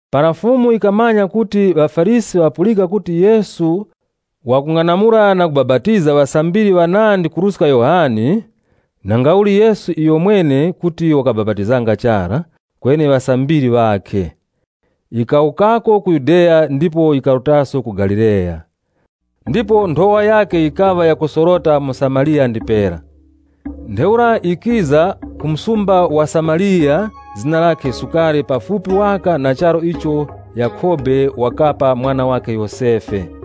Para Fumu yikamanya kuti ŵaFarisi ŵapulika kuti Yesu wakung'anamula na kubapatiza ŵasambiri ŵanandi kuruska Yohane, (nangauli, Yesu iyomwene kuti wakabapatizanga chara, kweni ŵasambiri ŵakhe,) yikawukako ku Yudeya ndipo yikarutaso ku Galileya. Ndipo nthowa yakhe yikaŵa yakusorota mu Samariya ndipera. Ntheura wakiza ku msumba wa Samariya zina lakhe Sukare pafupi waka na charu icho Yakhobe wakapa mwana wakhe Yosefe.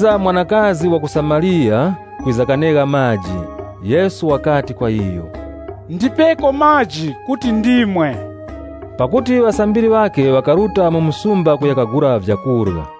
Mwanakazi wa ku Samariya wakiza kuti waneghe maji. Yesu wakati kwa iyo, “Undipeko maji ndimwe.” Pakuti ŵasambiri ŵakhe ŵakaruta mu msumba kuya kagula vyakurya.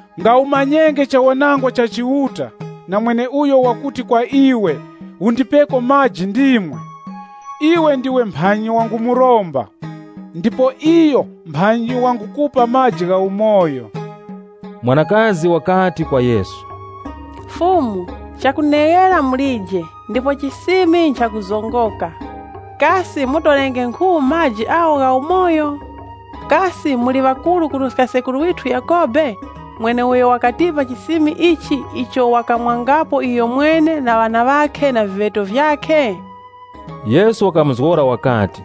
Yesu wakamuzgora kuti, “Nga umanyenge chawanangwa cha Chiuta, na mweneuyo wakuti kwa iwe, ‘Undipeko maji ndimwe,’ iwe ndiwe mphanyi wangumuromba, ndipo iyo mphanyi wangukupa maji gha umoyo.” Mwanakazi wakati kwa Yesu, “Fumu, chakuneghera mulije, ndipo chisimi nchakuzongoka. Kasi mutorenge nkhu maji agho gha umoyo? Kasi muli ŵakuru kuruska sekuru withu Yakhobe mweneuyo wakatipa chisimi ichi icho wakamwangapo iyomwene na ŵana ŵakhe na viŵeto vyakhe?” Yesu wakamuzgora wakati,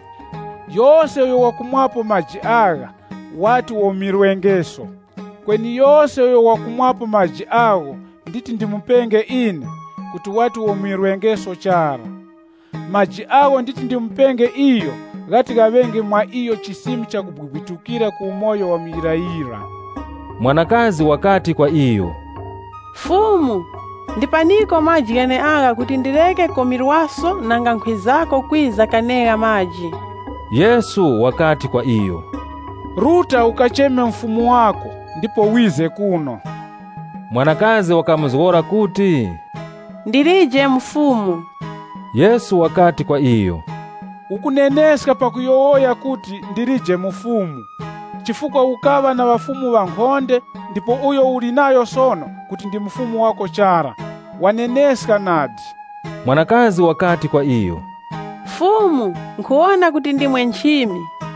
“Yose uyo wakumwapo maji agha, wati womirwengeso. Kweni yose uyo wakumwapo maji agho nditi ndimupenge ine, kuti wati womirwengeso chara. Maji agho nditi ndimupenge iyo ghati ghaŵenge mwa iyo chisimi chakubwibwitukira ku umoyo wa muyirayira.” Mwanakazi wakati kwa iyo, “Fumu, ndipaniko maji gheneagha kuti ndireke komirwaso nanga nkhwizako kwiza kanegha maji.” Yesu wakati kwa iyo, “Ruta ukacheme mufumu wako ndipo wize kuno.” Mwanakazi wakamuzgora kuti, “Ndilije mufumu.” Yesu wakati kwa iyo, “Ukuneneska pakuyowoya kuti ‘Ndilije mufumu,’ chifukwa ukaŵa na ŵafumu ŵankhonde ndipo uyo uli nayo sono kuti ndi mufumu wako chara, waneneska nadi.” Mwanakazi wakati kwa iyo, “Fumu, nkhuwona kuti ndimwe nchimi.”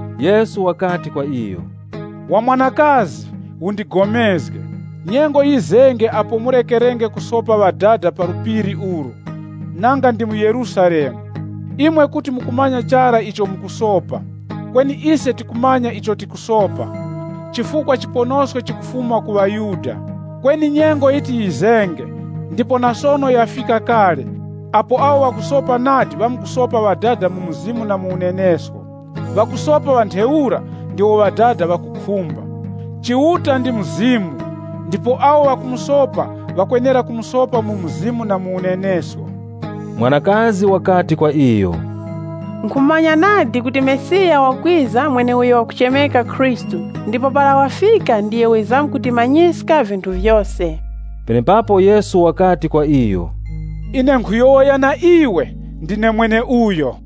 Yesu wakati kwa iyo, “Wa mwanakazi, upulikane nane, nyengo yizenge apo murekerenge kusopa Ŵadada pa phiri ili, nanga ndi mu Yerusalemu. Imwe kuti mukumanya chara icho mukusopa. Kweni ise tikumanya icho tikusopa, chifukwa chiponosko chikufuma ku ŵaYuda. Kweni nyengo yiti yizenge ndipo na sono yafika kale apo awo ŵakusopa nadi ŵamkusopa Ŵadada mu Mzimu na mu unenesko. Ŵakusopa ŵa ntheura ndiwo Ŵadada ŵakukhumba. Chiuta ndi Mzimu ndipo awo ŵakumusopa ŵakwenera kumusopa mu Mzimu na mu unenesko.” Mwanakazi wakati kwa iyo, “Nkhumanya nadi kuti Mesiya wakwiza mweneuyo wakuchemeka Khristu, ndipo para wafika ndiyo wizamkutimanyiska vinthu vyose.” Penepapo Yesu wakati kwa iyo, “Ine nkhuyowoya na iwe ndine mweneuyo.”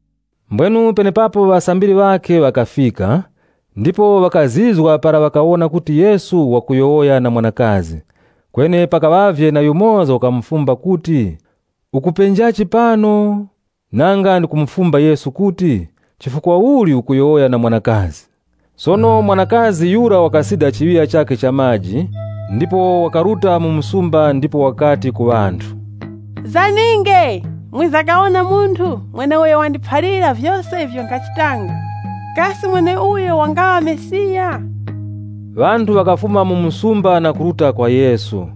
Mbwenu penepapo ŵasambiri ŵakhe ŵakafika, ndipo ŵakazizwa para ŵakawona kuti Yesu wakuyowoya na mwanakazi. Kweni pakaŵavye na yumoza wakufumba kuti, “Ukupenjachi pano?” Nanga ndikumufumba Yesu kuti, “Chifukwa uli ukuyowoya na mwanakazi?” Sono mwanakazi yura wakasida chiŵiya chakhe cha maji ndipo wakaruta mu msumba ndipo wakati ku ŵanthu, “Zaninge mwiza kawona munthu mweneuyo wandiphalira vyose ivyo nkhachitanga. Kasi mweneuyo wangaŵa Mesiya?” Ŵanthu ŵakafuma mu msumba na kuruta kwa Yesu.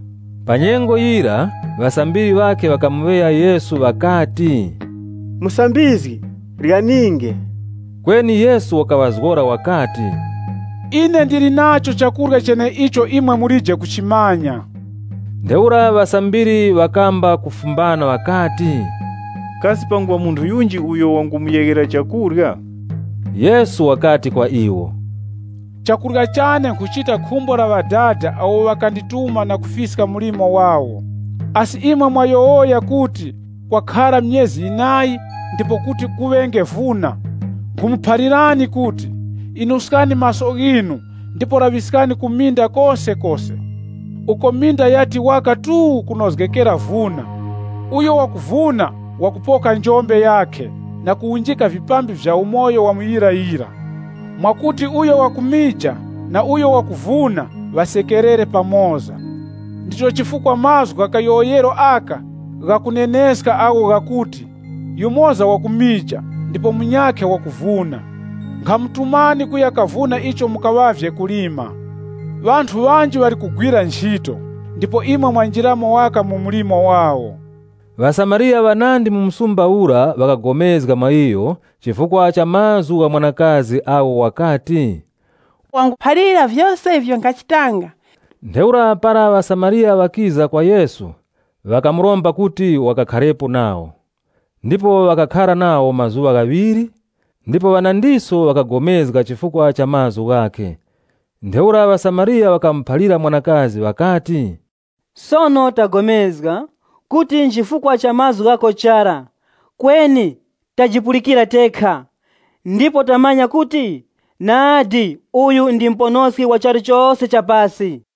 Pa nyengo yira ŵasambiri ŵakhe ŵakamuŵeya Yesu ŵakati, “Musambizgi, ryaninge.” Kweni Yesu wakaŵazgora wakati, “Ine ndili nacho chakurya cheneicho imwe mulije kuchimanya.” Ntheura ŵasambiri ŵakamba kufumbana ŵakati, “Kasi panguŵa munthu yunji uyo wangumuyeghera chakurya?” Yesu wakati kwa iwo, “Chakurya chane nkhuchita khumbo la Ŵadada awo ŵakandituma na kufiska mlimo wawo. Asi imwe mukuyowoya kuti ‘Kwakhara myezi yinayi ndipo kuti kuŵenge vuna.’ Nkhumuphalirani kuti, inuskani maso ghinu ndipo laŵiskani ku minda kosekose, uko minda yati waka tuu kunozgekera vuna. Uyo wakuvuna wakupoka njombe yakhe na kuwunjika vipambi vya umoyo wa muyirayira, mwakuti uyo wakumija na uyo wakuvuna ŵasekerere pamoza. Ndicho chifukwa mazgu gha kayowoyero aka ghakuneneska agho ghakuti, ‘Yumoza wakumija ndipo munyakhe wakuvuna.’ Nkhamutumani kuya kavuna icho mukaŵavye kulima. Ŵanthu ŵanji ŵali kuteŵeta mlimo ndipo imwe mwanjiramo waka mu mlimo wawo.” ŴaSamariya ŵanandi mu msumba ura, ŵakapulikana mwa iyo chifukwa cha mazgu gha mwanakazi agho wakati, “Wangundiphalira vyose ivyo nkhachitanga.” Ntheura para ŵaSamariya ŵakiza kwa Yesu, ŵakamuromba kuti wakakharepo nawo, ndipo wakakhara nawo mazuŵa ghaŵiri. Ndipo ŵanandiso ŵakapulikana chifukwa cha mazgu ghakhe. Ntheura ŵaSamariya ŵakamuphalira mwanakazi ŵakati, “Sono tapulikana, kuti nchifukwa cha mazgu ghako chara, kweni tajipulikira tekha, ndipo tamanya kuti, nadi uyu ndi Muponoski wa charu chose cha pasi.”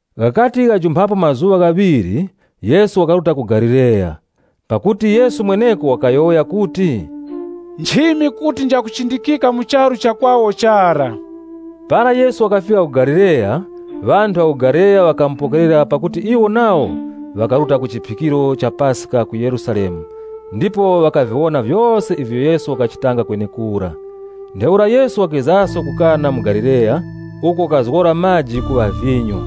Ghakati ghajumpha mazuŵa ghaŵiri Yesu wakaruta ku Galileya. Pakuti Yesu mwenecho wakayowoya kuti, “Nchimi kuti njakuchindikika mu charu cha kwawo chara.” Para Yesu wakafika ku Galileya, ŵanthu ŵa ku Galileya ŵakamupokerera pakuti iwo nawo ŵakaruta ku chiphikiro cha Paska ku Yerusalemu ndipo ŵakaviwona vyose ivyo Yesu wakachita kwenekura. Ntheura Yesu wakizaso ku Kana mu Galileya uko wakazgora maji kuŵa vinyo.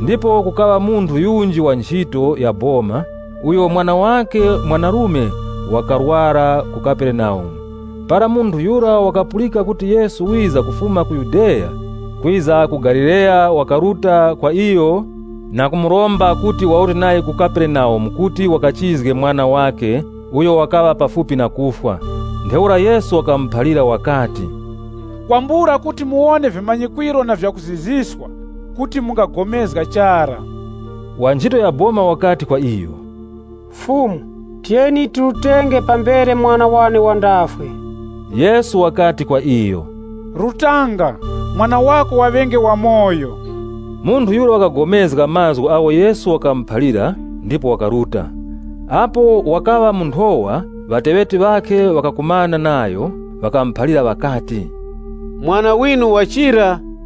Ndipo kukaŵa munthu yunji wa nchito ya boma uyo mwana wakhe mwanarume wakarwara ku Kaperenaumu. Para munthu yura wakapulika kuti Yesu wiza kufuma ku Yudeya, kwiza ku Galileya wakaruta kwa iyo na kumuromba kuti warute nayo Kaperenaumu kuti wakachizge mwana wakhe, uyo wakaŵa pafupi na kufwa. Ntheura Yesu wakamuphalira wakati, “Kwambula kuti muwone vimanyikwiro na vyakuzizwiska, kuti mungapulikana chara.” Wa nchito ya boma wakati kwa iyo, “Fumu, tiyeni tirutenge pambere mwana wane wandafwe.” Yesu wakati kwa iyo, “Rutanga, mwana wako waŵenge wamoyo.” Munthu yura wakapulikana na mazgu agho Yesu wakamuphalira ndipo wakaruta. Apo wakaŵa mu nthowa ŵateŵeti ŵakhe ŵakakumana nayo, ŵakamuphalira ŵakati, “Mwana winu wachira.”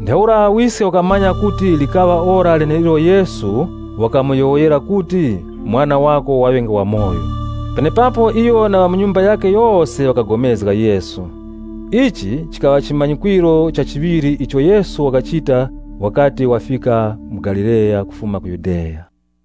Ntheura wiske wakamanya kuti yikaŵa ora leneilo Yesu wakamuyowoyera kuti, “Mwana wako waŵenge wamoyo.” Penepapo iyo na ŵa mu nyumba yakhe yose ŵakapulikana mwa Yesu. Ichi chikaŵa chimanyikwiro cha chiŵiri icho Yesu wakachita wakati wafika mu Galileya kufuma ku Yudeya.